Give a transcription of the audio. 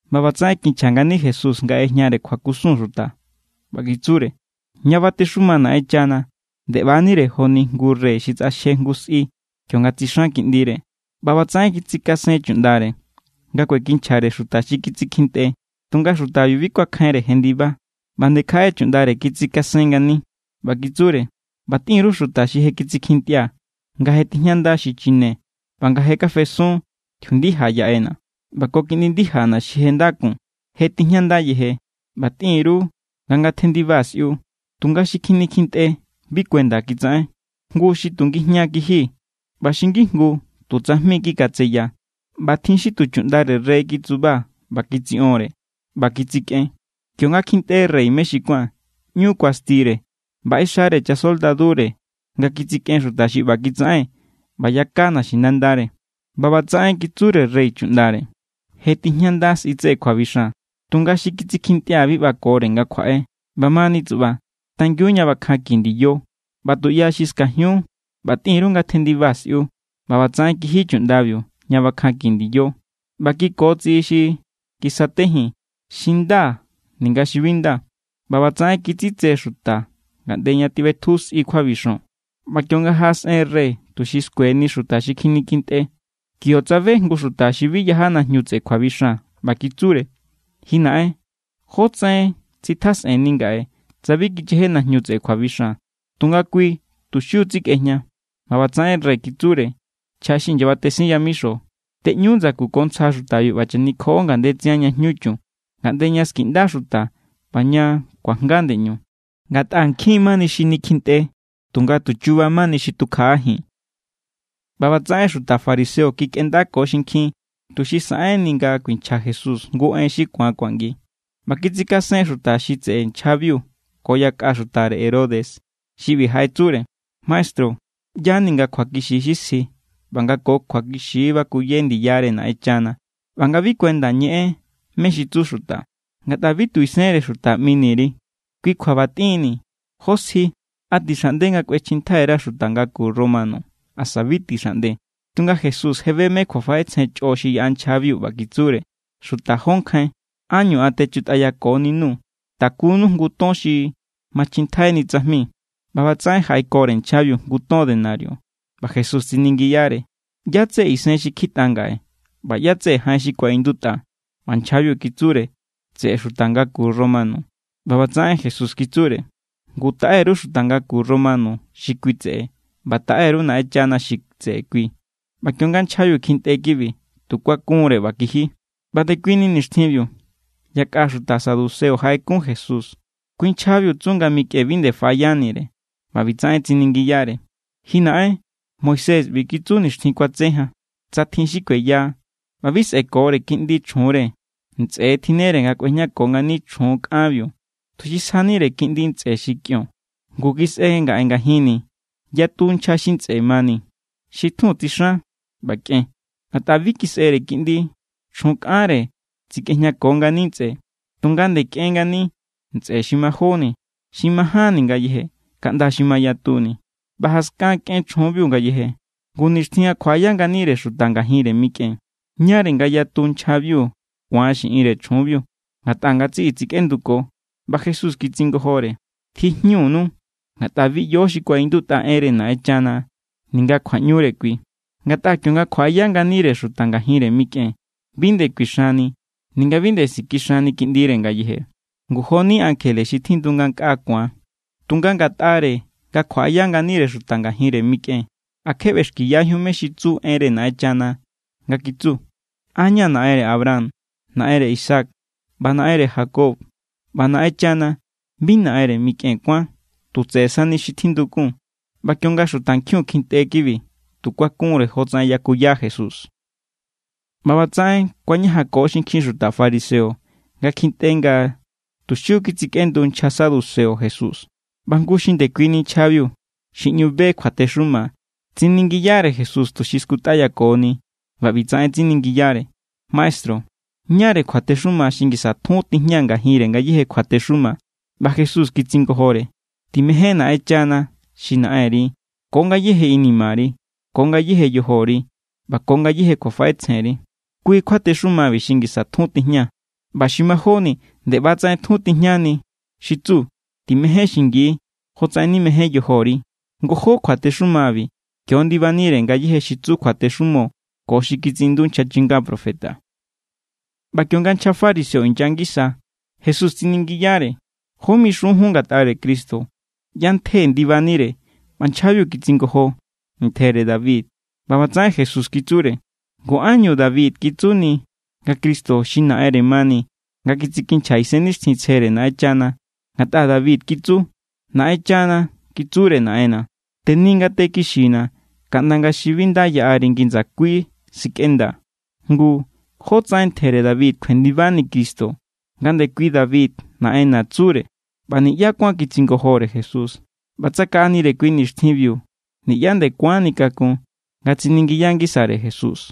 ꞌBa ꞌbatsaꞌen kinchja ngani Jesús nga ꞌejñare kjuakusun xuta, ꞌba kitsure: —Ña batexuma Naꞌenchana nde ꞌba=nire joni jngu rey xi tsꞌaxje jngu sꞌi kionga tsixan kiꞌndire. ꞌBa ꞌbatsaꞌen kitsikasen chuꞌndare nga kuekinchjare xuta xi kitsikjintꞌe. Tunga xutabiu bi kuakjainre jendiba. ꞌBa nde kjaꞌe chuꞌndare kitsikasen ngani, ꞌba kitsure: “ꞌBa tꞌin_ru xuta xi je kitsikjintꞌia̱, nga je tijñandana̱ xi chine ꞌba nga je kafesun tjiundija yaꞌena̱ ꞌba ko kiꞌndi ndijana̱ xi je nda kun. Je tijñanda yeje. ꞌBa tꞌin_ru nga ngatjendiba sꞌiu.” Tunga xi kjinikjintꞌe bi kuenda kitsaꞌen. Jngu xi tu ngijña= kiji, ꞌba xi ngijngu tu tsajmi= kikatseya, ꞌba tjin xi tu chuꞌndare rey kitsuba ꞌba kitsiꞌonre ꞌba kitsikꞌen. Kionga kjintꞌe rey mé xi kuán, ꞌñu kuastire ꞌba ꞌexare chasoldadure nga kitsikꞌen xuta xi ꞌba kitsaꞌen ꞌba yaka naxinandare. ꞌBa ꞌbatsaꞌen kitsure rey chuꞌndare: “Je tijñanda sꞌi tseꞌe kjuabixan, tunga xi kitsikjintꞌia̱ bi ꞌbakore nga kjuaꞌe. ꞌBamani tsuꞌba, tangiun ña bakjanki ndiyo ꞌba tuꞌya xi skajiun ꞌba tꞌin_ru ngatjendiba sꞌiu.” ꞌBa ꞌbatsaꞌen kiji chuꞌndabiu ña bakjanki ndiyo. ꞌBa kikotsiꞌi xi kisatejin, xi nda ninga xi bi nda. ꞌBa ꞌbatsaꞌen kitsitse xuta ngaꞌnde ña tjiꞌbetju sꞌi kjuabixon. ’ꞌBa kionga jaꞌasꞌen rey tuxi skueni xuta xi kjinikjintꞌe, kio tsabe jngu xuta xi bi yaja najñu tseꞌe kjuabixan. ꞌBa kitsure: “Ji naꞌen, ¿jó tsaꞌen tsitjasꞌenni ngaꞌe tsa bi kicheje najñu tseꞌe kjuabixan?” Tunga kui tu xiu= tsikꞌejña. ꞌBa ꞌbatsaꞌen rey kitsure nchja xi inyabatesin yamixo: “Tꞌeꞌñu ndsaku ko ntsja xutabiu ꞌba chanikjoꞌo ngandetsian ña jñu chun, ngaꞌnde ña skiꞌnda xuta ꞌba ña kuajnga ndeꞌñu.” Ngatꞌa nkjin= mani xi nikjintꞌe, tunga tu chuba mani xi tukjaꞌajin. ꞌBa ꞌbatsaꞌen xuta fariseo kikꞌendako xinkjin, tuxi saꞌenni nga kuinchja Jesús jngu en xi ku̱an kuangi. ꞌBa kitsikasen xuta xi tseꞌe nchjabiu ko yakꞌa xutare Herodes xi ꞌbi jaꞌetsure: —Maestru, ꞌya=ni nga kjuakixi= xi sji ꞌba nga ko kjuakixi bakuye ndiyare Naꞌenchana ꞌba nga bi kuenda ñeꞌen mé= xi tsu xuta, ngatꞌa bi tu isenre xuta ꞌmini_ri. Kui kjua ꞌba tꞌinni̱, ¿jó sji? ¿A tixaꞌnde nga kꞌuechjintjai_ra xuta ngaku romano asa bi tixaꞌnde? Tunga Jesús je be mé= kjuafaꞌetsjen chꞌo xi yaꞌa nchjabiu, ꞌba kitsure: —Xuta jó nkjain, ¿ánñu an techutꞌayakoninu? Takunu jngu ton xi machjintjaini tsajmi. ꞌBa ꞌbatsaꞌen jaꞌekore nchjabiu jngu ton denario. ꞌBa Jesús tsiningiyare: —¿ꞌYá= tseꞌe isen xi kjitꞌa ngaꞌe ꞌba ꞌyá= tseꞌe jaꞌen xi kuaꞌindutꞌa? ꞌBa nchjabiu kitsure: —Tseꞌe xuta ngaku romano. ꞌBa ꞌbatsaꞌen Jesús kitsure: —Ngu, taꞌe_ru xuta ngaku romano xi kui tseꞌe, ꞌba taꞌe_ru Naꞌenchana xi tseꞌe kui. ꞌBa kionga nchjabiu kjintꞌe kibi, tu kuakunre ꞌba kiji. ꞌBa ndekuini nixtjinbiu, yakꞌa xuta saduceo jaꞌekun Jesús. Kui= nchjabiu tsu nga mikꞌen bi nde faꞌayanire. ꞌBa ꞌbitsaꞌen tsiningiyare: —Ji naꞌen, Moisés ꞌbi kitsu nixtjin kuatse jan: “Tsa tjin xi kueya ꞌba bi sꞌe̱kore kiꞌndi chjunre, ntsꞌe= tjinnere nga kꞌuejñako ngani chjun kꞌanbiu, tuxi sjanire kiꞌndi ntsꞌe xi kꞌion.” Ngu kisꞌe ngaꞌe ngajinni̱ yatu nchja xi ntsꞌe mani. Xi titjun tsixan ꞌba kꞌen. Ngatꞌa bi kisꞌere kiꞌndi, chjun kꞌanre tsikꞌejñako ngani ntsꞌe. Tunga nde kꞌen ngani ntsꞌe xi majóni, xi majánni ngayeje, kaꞌnda xi mayatuni. ꞌBa jaskan kꞌen chjunbiu ngayeje. Ngu, nixtjin nga kjuaꞌaya nganire xuta ngajinre mikꞌen, ¿ñáre nga yatu nchjabiu ku̱an xiꞌinre chjunbiu? Ngatꞌa ngatsiꞌi tsikꞌenduko. ꞌBa Jesús kitsingojore: —Tjijñunu, ngatꞌa bi ꞌyo mé= xi kuaꞌindutꞌa enre Naꞌenchana ninga kjuaꞌñure kui. Ngatꞌa kionga kjuaꞌaya nganire xuta ngajinre mikꞌen, bi nde kuixanni ninga bi nde sikixanni kiꞌndire ngayeje. Ngu joni ankjele xi tjindu ngankꞌaa ku̱an. Tunga ngatꞌare nga kjuaꞌaya nganire xuta ngajinre mikꞌen, ¿a kje ꞌbexkiyajíun mé= xi tsu enre Naꞌenchana? Nga kitsu: “An= ña̱ Naꞌenre Abraham, Naꞌenre Isaac ꞌba Naꞌenre Jacob.” ꞌBa Naꞌenchana bi Naꞌenre mikꞌen kuán, tu tseꞌe sani xi tjindukun. ꞌBa kionga xutankjiun kjintꞌe kibi, tu kuakunre jotsaꞌen yakuya Jesús. ꞌBa ꞌbatsaꞌen kuañajanko xinkjin xuta fariseo nga kjintꞌe nga tu xiu= kitsikꞌendu nchja saduceo Jesús. ꞌBa jngu xi ndekuini nchjabiu, xi ꞌñu be kjuatexuma, tsiningiyare Jesús tuxi skutꞌayakoni, ꞌba ꞌbitsaꞌen tsiningiyare: —Maestru, ¿ñáre kjuatexuma xi ngisa tjun tijña ngajinre ngayéje kjuatexuma? ꞌBa Jesús kitsingojore: —“Timején Naꞌenchana xi Naꞌenri ko ngayéje inimari, ko ngayéje yojori, ꞌba ko ngayéje kjuafaꞌetsjenri.” Kui= kjuatexumabi xi ngisa tjun tijña. ꞌBa xi majóni nde ꞌba=tsaꞌen tjun tijñani, xi tsu: “Timején xingi jotsaꞌen nimején yojori.” Ngojó kjuatexumabi, kio= ndibanire ngayéje xi tsu kjuatexumo ko xi kitsiꞌindu nchja chinga profeta. ꞌBa kionga nchja fariseo inya ngisa, Jesús tsiningiyare: —¿Jó mixun jun ngatꞌare Cristo? ¿ꞌYá= ntje ndibanire? ꞌBa nchjabiu kitsingojo: —Ntjere David. ꞌBa ꞌbatsaꞌen Jesús kitsure: —Ngu, ¿ánñu David kitsuni nga Cristo xi Naꞌenre mani, nga kitsikinchja Isennixtjintsjere Naꞌenchana? Ngatꞌa David kitsu: Naꞌenchana kitsure Naꞌenna̱: “Teni ngate kixina̱, kaꞌnda nga xi bi nda yaꞌari ngi ndsakui sikꞌendaa̱.” Ngu, ¿jótsaꞌen ntjere David kjuendibani Cristo nga ndekui David Naꞌenna̱ tsure? ꞌBa niꞌyá kuán kitsingojore Jesús. ꞌBa tsakaꞌanire kui nixtjinbiu niꞌyá nde kuánni kakun nga tsiningiya ngisare Jesús.